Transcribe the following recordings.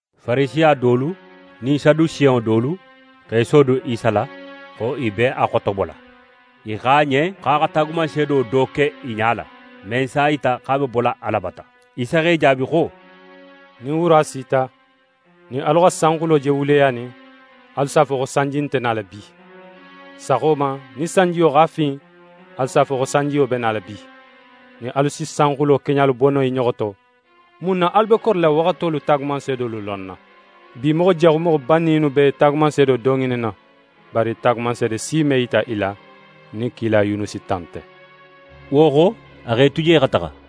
Farisiya dolu nin Sadusenŋo dolu x'e sodun Isa la xo i be a xotobola. I xo a ɲen xo a xa taagumanseedo do ke i ɲala, men s'a yita xo a be bola Ala bata. Isa x'e jaabi xo: «Nin wura sita, nin alu xa sanxulo je wuleyanin, alu s'a fo xo sanji nte nala bi. Saxo ma, nin sanjiyo x'a fin, alu s'a fo xo sanjiyo be nala bi. Nin alu si sanxulo keɲalu bo no i ɲoxo to, mun na alu be korila waxatolu taagumanseedolu lonna? Bi moxo jaxu moxo banninŋolu be taagumanseedo do ŋininna, bari taagumanseede si me yita i la nin kila Yunusi ta nte.» Wo xo, a x'e tu je xa taxa.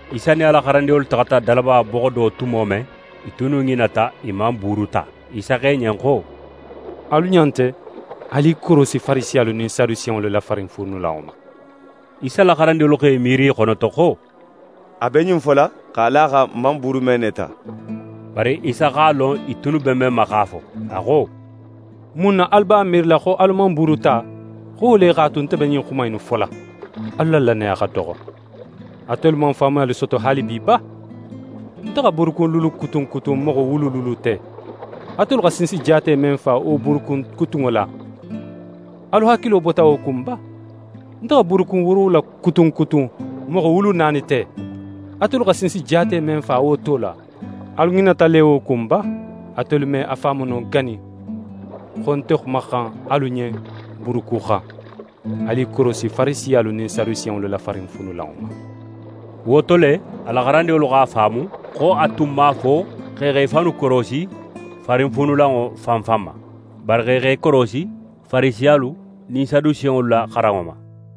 Isa nin a la xarandinŋolu taxata dalaba boxo do tumo men, i tunnu ŋinata i man buuru ta. Isa xo i ɲen xo: «Alu ɲa nte, alu i korosi Farisiyalu nin Sadusenŋolu la farinfuunulanŋo ma.» Isa la xarandinŋolu x'e miiri i xonoto xo: «A be ɲin fola x'a la a xan n man buuru men ne ta.» Bari Isa x'a lon i tunnu be men ma x'a fo, a xo: «Mun na alu b'a miirila xo alu man buuru ta, xo wo le x'a tu nte be ɲin xuma innu fola? Alu la lannaya xa doxo! Atelu man faamuyali soto haalibi ba? Nte xa buurukun luulu kutun kutun moxo wulu luulu te, atelu xa sinsi jaate men fa wo buurukun kutunŋo la, alu hakilo bota wo kun ba? Nte xa buurukun woorowula kutun kutun moxo wulu naani te, atelu xa sinsi jaate men fa wo to la, alu ŋinata le wo kun ba? Atelu me a faamu no gani xo ń nte xumaxan alu ɲen buuru ku xan? Alu i korosi Farisiyalu nin Sadusenŋolu la farinfuunulanŋo ma.» Wo to le, a la xarandinŋolu x'a faamu xo a tun man a fo xo i x'e fannu korosi farinfuunulanŋo fan fan ma, bari xo i x'e korosi Farisiyalu nin Sadusenŋolu la xaranŋo ma.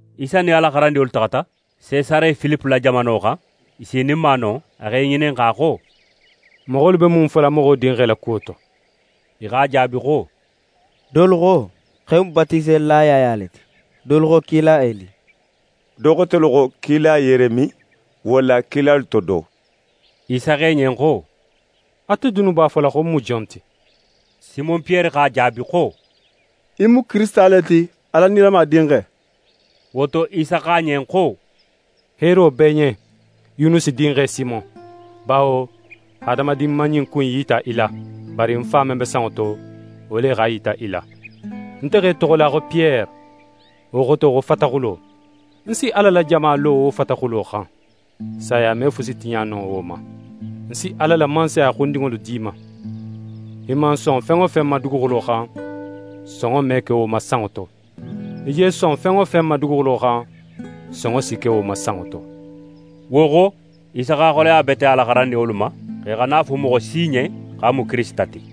Isa nin a la xarandinŋolu taxata Sesare Filipe la jamano xan. I sininma non, a x'e ŋininxa xo: «Moxolu be mun fola Moxo Dinxe la kuwo to?» I x'a jaabi xo: «Dolu xo, xo í mu Batiselila Yaya le ti, dolu xo kila Eli, do xotelu xo kila Yeremi, walla kilalu to do.» Isa xo i ɲen xo: «Ate dunnu b'a fola xo ń mu jon ti?» Simon Piyere x'a jaabi xo: «Í mu Kirisita le ti, Ala nilama Dinxe.» Wo to, Isa xo a ɲen xo: «Heero b'é ɲen Yunusi dinxe Simon; bawo hadamadin man ɲin ku in yita í la, bari ń Fa men be sanŋo to, wo le x'a yita í la. Nte x'é toxola xo Piyere, wo xoto xo fataxulo. Ń si Ala la jama lo wo fataxulo xan. Saya me fusi tiɲa no wo ma. Ń si Ala la Mansaya xundinŋolu d'í ma. Í man son fen wo fen ma duguxulo xan, sonŋo me ke wo ma sanŋo to; í je son fen wo fen ma duguxulo xan, sonŋo si ke wo ma sanŋo to.» Wo xo, Isa x'a xoleya bete a la xarandinŋolu ma, xo i xana a fo moxo si ɲen xo a mu Kirisita ti.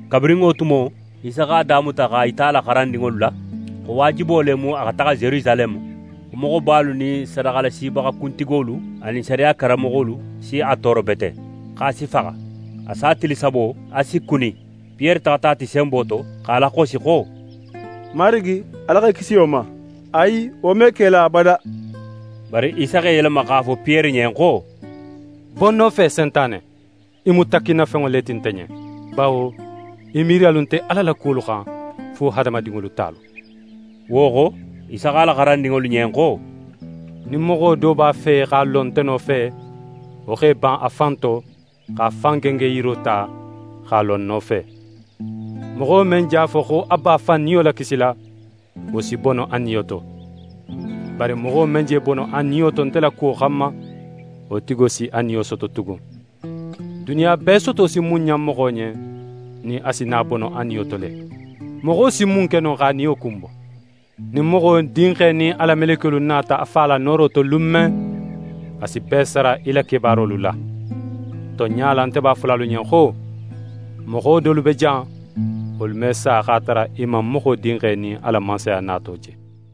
Kabirin wo tumo, Isa x'a damuta x'a yita a la xarandinŋolu la xo waajibo le mu a xa taxa Yerusaleme, xo moxobalu nin sadaxalasibaxa kuntigolu anin sariya karanmoxolu si a tooro bete, x'a si faxa. A sa tili sabo, a si kuni. Piyere taxata a ti senbo to, x'a laxosi xo: «Marigi, Ala x'é kisi wo ma! Ayi, wo me ke í la abada!» Bari Isa x'é yelema x'a fo Piyere ɲen xo: «Bo ń nofe, Sentane! Í mu takkinnafenŋo le ti nte ɲen. Bawo í miiriyalu nte Ala la kuwolu xan, fo hadamadinŋolu talu.» Wo xo, Isa xo a la xarandinŋolu ɲen xo: «Nin moxo do b'a fe x'a lo nte nofe, wo x'é ban a fan to, x'a fan gengenyiro ta, x'a lo ń nofe. Moxo men je a fo, xo a b'a fan niyo lakisila, wo si bono a niyo to. Bari moxo men je bono a niyo to nte la kuwo xanma, wo tigo si a niyo soto tugun. Duniya bee soto si mun ɲan moxo ɲen, nin a si na bono a niyo to le? Moxo si mun ke no x'a niyo kunbo? Nin Moxo Dinxe nin a la melekiyolu nata a Fa la nooro to lun men, a si bee sara í la kebaarolu la. Tonɲa la, nte b'a fola alu ɲen xo: Moxo dolu be jan, wolu me sa x'a tara i man Moxo Dinxe nin a la Mansaya nato je.»